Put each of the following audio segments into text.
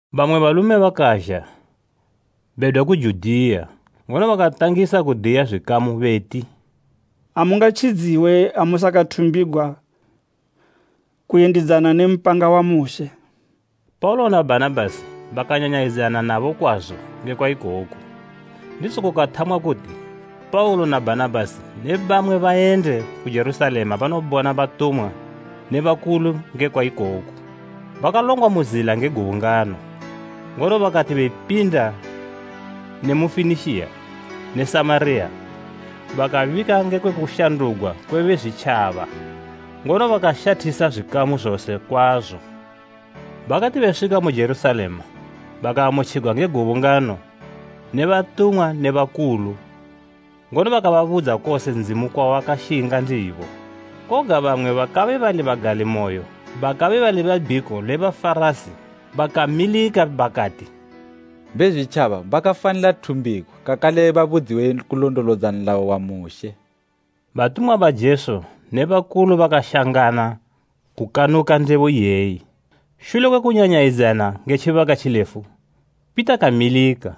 Bamwe balume bakazha bedwa ku Judiya, ngono bakatangisa kudiya zwikamu beti, “Amungatjidziwe ha musakathumbigwa kuyendidzana ne mpanga wa Mushe.” Paulo na Bhanabhasi bakanyanyayidzana nabo kwazo ngekwa ikoku, ndizo kukathamwa kuti Paulo na Bhanabhasi ne bamwe bayende ku Jerusalema banobona batumwa ne bakulu ngekwa ikoku. Bakalongwa mu zila nge gubungano; ngono bakati bepinda ne mu Fenikiya ne Samariya, bakabika ngekwe kushandugwa kwe Bezwitjaba, ngono bakashathisa zwikamu zose kwazo. Bakati beswika mu Jerusalema bakaamutjigwa nge gubungano ne batumwa ne bakulu, ngono bakababudza kose Ndzimu kwawakashinga ndibo. Koga bamwe be bagalimoyo bakabe bali be bhiko le Bafarasi bakamilika bakati, “Bezwitjaba bakafanila thumbigwa kakale babudziwe kulondolodza nlayo wa Mushe.” Batumwa ba Jesu ne bakulu bakashangana kukanuka ndebo iyeyi. Shule kwe kunyanyayidzana nge tjibaka tjilefu Pita kamilika,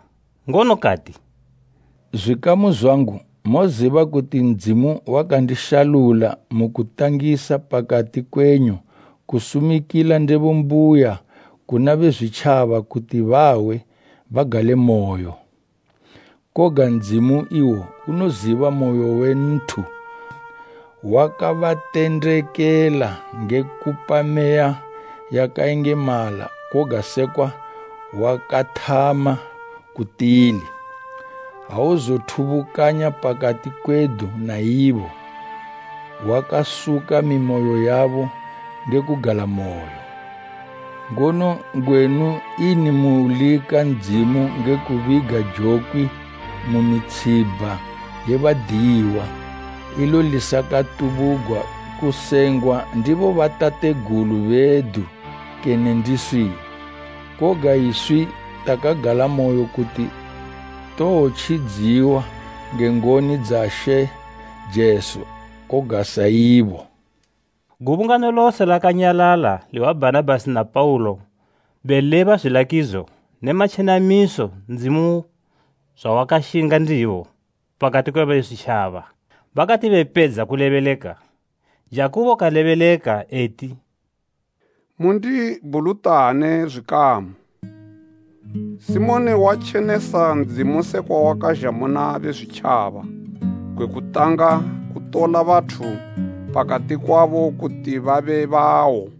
ngono kati “Zwikamu zwangu, moziba kuti Ndzimu wakandishalula mu kutangisa pakati kwenyu kusumikila ndebo mbuya kuna Bezwitjaba kuti bahwe, bagalemoyo. Koga Ndzimu iwo unoziba moyo we nthu wakabatendekela nge kupa Meya yakayengemala koga sekwa wakathama ku tili. Auzothubukanya pakati kwedu na ibo, wakasuka mimoyo yabo nge kugalamoyo. Ngono ngwenu ini mulika Ndzimu nge kubiga jokwi mu mitshibha ye badiyiwa, ilo lisakatubugwa kusengwa ndi bobatategulu bedu kene ndiswi? Koga iswi takagalamoyo kuti towotjidziwa nge ngoni dza She Jesu, koga sa ibo.” Gubungano lose lakanyalala lihwa Bhanabhasi na Paulo beleba zwilakidzo ne matjenamiso Ndzimu zwawakashinga ndibo pakati kwe Bezwitjaba. Bakati bepedza kulebeleka, Jakubo kalebeleka eti, “Mundibhulutane, zwikamu! Simoni watjenesa Ndzimu sekwa wakazha muna Bezwitjaba gwe kutanga kutola bathu pakati kwabo kuti babe bawo.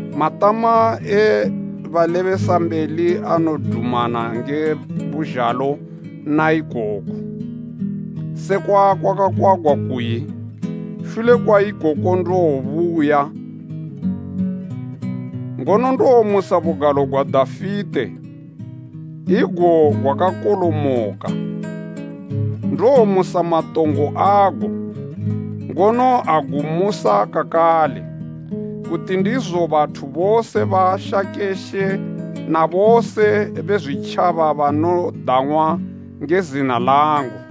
Matama e balebesambeli anodumana nge buzhalo na ikoku, sekwa kwakakwagwa kuyi, “ ‘Shule kwa ikoku ndowobuya, ngono ndowomusa bugalo gwa Dafite igo gwakakolomoka. Ndowomusa matongo ago, ngono agumusa kakale, kuti ndizo bathu bose bashake She na bose Bezwitjaba banodang'wa nge zina langu.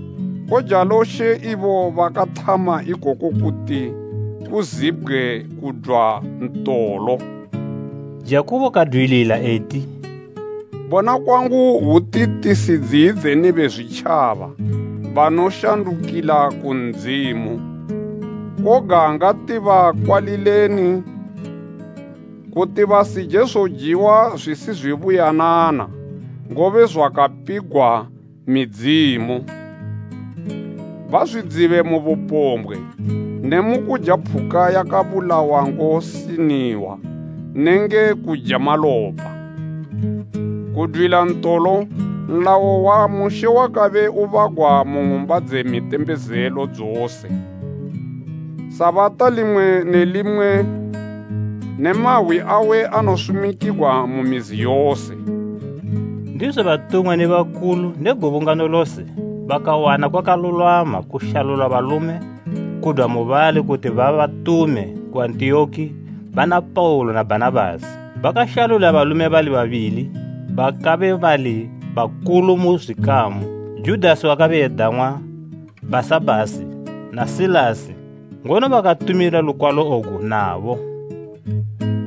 Kojalo She ibo bakathama ikoku kuti kuzibgwe kudwa ntolo.’” Jakubo kadwilila eti, “Bona kwangu hwuti tisidziyidzeni Bezwitjaba banoshandukila ku Ndzimu. Koga ngatibakwalileni, kuti basije zojiwa zwisizwibuyanana, ngobe zwakapigwa midzimu, bazwidzibe mu bupombgwe ne mu kuja phuka yabulawa ngosiniwa nenge kuja malopa. Kudwila ntolo nlayo wa Mushe wakabe ubagwa mu ng'umba dze mitembezelo dzose, Sabata limwe ne limwe ne mahwi awe anosumikigwa mu mizi yose.” Ndizo batumwa ne bakulu ne gubungano lose bakawana kwakalulwama kushalula balume kudwa mubali kuti babatume ku Antiyoki bana Paulo na Bhanabhasi. Bakashalula balume babili bakabe bali bakulu mu zwikamu, Judasi wakabe edang'wa Bhasabhasi na Silasi, ngono bakatumila lukwalo ogu nabo,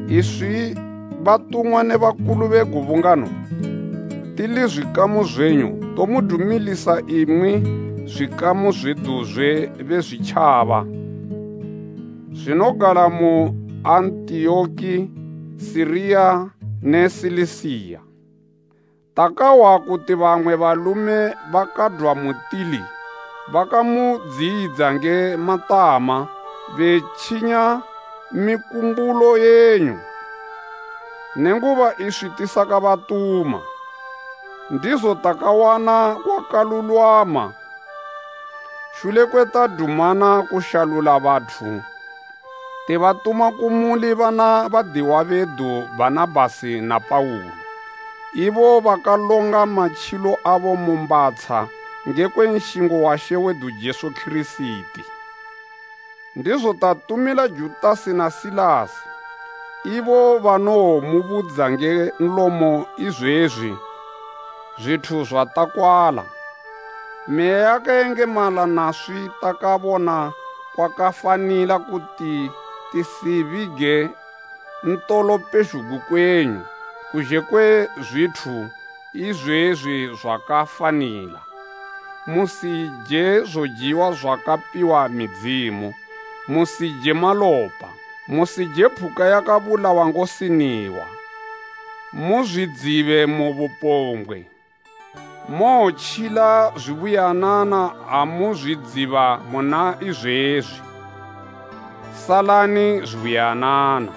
“Iswi, batumwa ne bakulu be gubungano, tili zwikamu zwenyu, tomudumilisa imwi zwikamu zwedu zwe Bezwitjaba zwinogala mu Antiyoki, Siriya ne Silisiya. Takahwa kuti bamwe balume bakadwa mutili bakamudziyidza nge matama, betjinya mikumbulo yenyu, nenguba iswi tisakabatuma. Ndizo takawana kwakalulwama shule kwe tadumana kushalula bathu tibatuma kumuli bana badiwa bedu Bhanabhasi na Paulo, ibo bakalonga matjilo abo mu mbhatsha ngekwe nshingo wa She wedu Jesu Kirisiti. Ndizo tatumila Judasi na Silasi, ibo banowomubudza nge nlomo izwezwi zwithu zwatakwala. Meya yakayengemala naswi takabona kwakafanila kuti tisibige ntolo pezhugwi kwenyu kuzhe kwe zwithu izwezwi zwakafanila: musije zojiwa zwakapiwa midzimu, musije malopa, musije phuka yakabulawa ngosiniwa, muzwidzibe mu bupombgwe. Mowotjila zubuyanana amuzwidziba muna izwezwi. Salani zubuyanana.”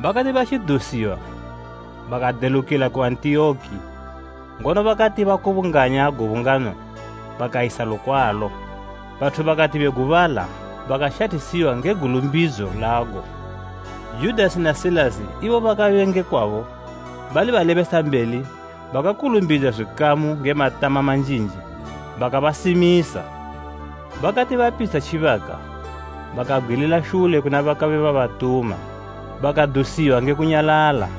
Bakati batjidusiwa bakadelukila ku Antiyoki ngono bakati bakubunganya gubungano bakayisa lukwalo. Bathu bakati begubala bakashathisiwa nge gulumbidzo lago. Judasi na Silasi ibo bakabe nge kwabo bali balebesambeli bakakulumbidza zwikamu nge matama manjinji bakabasimisa. Bakati bapitsha tjibaka, bakabgwilila shule kuna bakabe babatuma, bakadusiwa nge kunyalala. [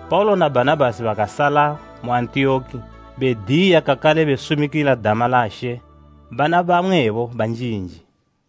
Paulo na Bhanabhasi bakasala mu Antiyoki bediya kakale besumikila dama la She bana bamwebo banjinji.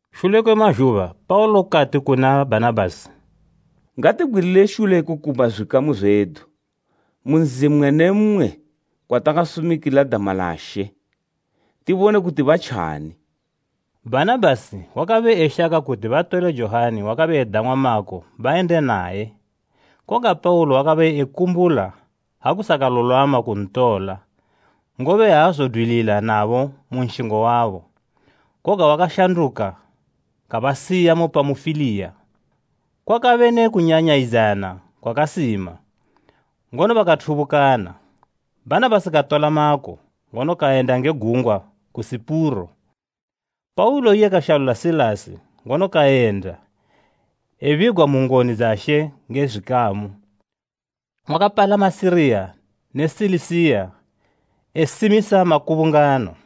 Shule kwe mazhuba Paulo kati kuna Bhanabhasi, “Ngatibgwilile shule kukumba zwikamu zwedu mu nzi mmwe ne mmwe kwatakasumikila dama la She, tibone kuti batjani.” Bhanabhasi wakabe eshaka kuti batole Johani wakabe edang'wa Mako bayende naye. Koga Paulo wakabe ekumbula ha kusakalulwama kuntola, ngobe aazodwilila nabo mu nshingo wabo, koga wakashanduka kabasiya mu Pamufiliya. Kwakabe ne kunyanyayidzana kwakasima, ngono bakathubukana. Bhanabhasi katola Mako, ngono kayenda nge gungwa ku Sipuro, Paulo iye kashalula Silasi, ngono kayenda, ebigwa mu ngoni dza She nge zwikamu. Wakapalama Siriya ne Silisiya, esimisa makubungano.